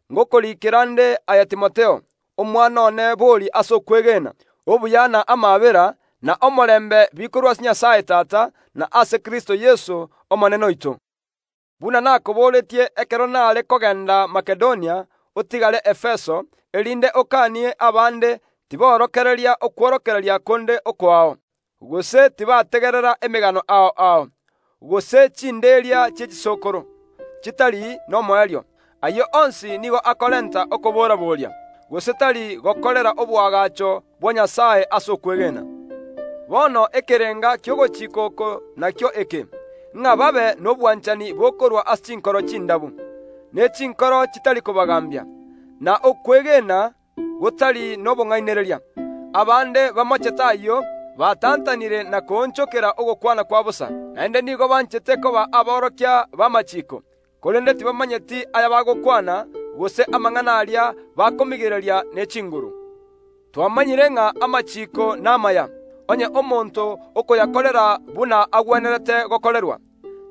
gochia ase aye Timotheo, omwana one bori ase okwegena: Obuya na amaabera, na omorembe bikorwa ase Nyasae Tata, na ase Kristo Yeso, Omonene oito. Buna nakoboretie ekero nare kogenda Makedonia, otigare Efeso, erinde okanie abande tiborokereria okworokereria konde okoao, gose tibategerera emegano ao ao, gose ebinimboria bie chisokoro bitakoera. Ayio onsi nigo akorenta okoamererania, gose tari goikerania emeroberio ya Nyasae eyio emanyekanete ase okwegena. Bono ekerenga ki’ogochika oko nakio eke, ng’a babe nobwanehani bokorwa ase chinkoro chindabu, ne chinkoro chitari kobagaambia, na okwegena gotari nobong’ainereria. Abande bamochete ayio, batantanire na koonchokera ogokwana kwa bosa. Naende nigo banchete koba aborokia b’amachiiko, korende tibamanyeti ayabagokwana, gose amang’ana aria bakomigereria ne chinguru. Twamanyire ng’a amachiiko namaya, onye omonto okoyakorera buna agwenerete gokorerwa,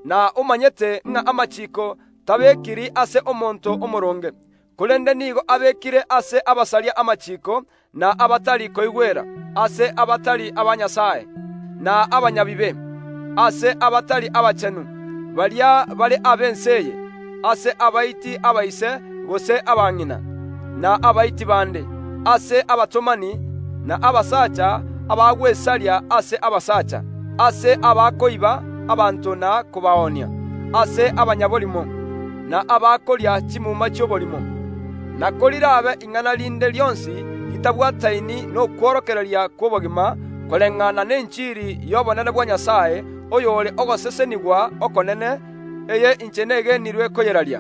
na omanyete ng’a amachiiko tabekiri ase omonto omooronge. Korende nigo abekire ase abasaria ba amachiiko, na abatari koigwera, ase abatari aba Nyasae, na abanyabibe, ase abatari abachenu, baria bare b’ense eye, ase abaiti abaise gose abang’ina, na abaiti bande, ase abatomani, na abasacha abagwesaria ase abasacha, ase abakoiba abanto na kobaonia, ase abanyaborimo, na abakoria chimuma chi’oborimo. Na korir’abe ing’ana rinde rionsi ritabwataini nokworokereria kw’obogima, koreng’ana nenchiri y’obonene bwa Nyasae, oyore ogosesenigwa okonene, eye inche negenirwe koyeraria.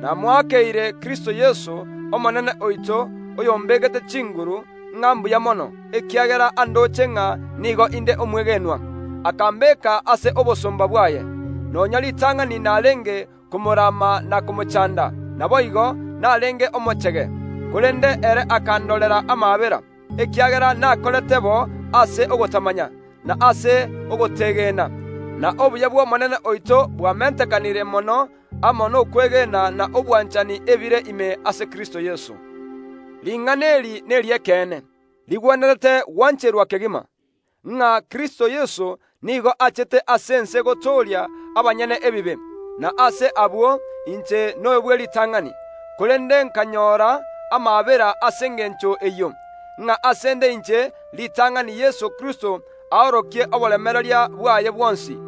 Namoakeire Kristo Yeso, Omonene oito, oyombeegete chinguru, ng’a mbuya mono, ekiagera andoche ng’a nigo inde omwegenwa. Akambeeka ase obosomba bwaye, nonya ritang’ani nareenge komorama na komochaanda, naboigo, nareenge omochege. Korende ere akandorera amaabera, ekiagera nakorete bo ase ogotamanya, na ase ogotegena, na obuya bwo Omonene oito bwamentekanire mono amo nokwegena na obwanchani ebire ime ase Kristo Yeso. Ring’ana eri neri’ekeene, rigwenerete gwancherwa kegima, ng’a Kristo Yeso nigo achete ase ense gotooria abanyene ebibe, na ase abwo inche noyo bw’eritang’ani. Korende nkanyora amaabera ase engencho eyio, ng’a ase ’nde inche ritang’ani Yeso Kristo aorokie oboremereria bwaye bwonsi,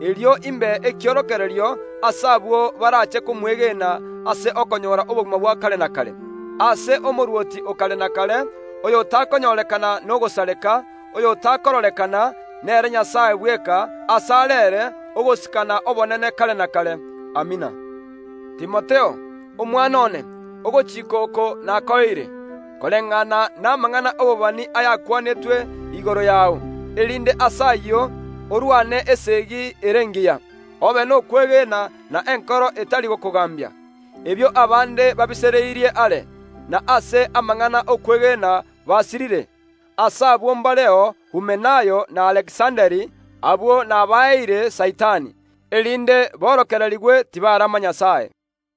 erio imbe ekiorokererio ase abwo baraache komwegena ase okonyora obogima bwa kare na kare. Ase Omorwoti o kare na kare, oyotakonyorekana nogosareka, oyotakororekana, nere Nyasae bweka, ase are ere ogosika na obonene kare na kare. Amina. Timotheo, omwana one, ogochika oko nakoeire, koreng’ana namang’ana y’obobani akwanetwe igoro yao, erinde ase ayio orwane esegi ere engiya. Obe nokwegena na enkoro etari gokogaambia, ebio abande babisereirie are, na ase amang’ana y’okwegena basirire. Ase abwo mbareo Humenayo na Alekisanda, abwo nabaeire Saitani, erinde borokererigwe tibarama Nyasae.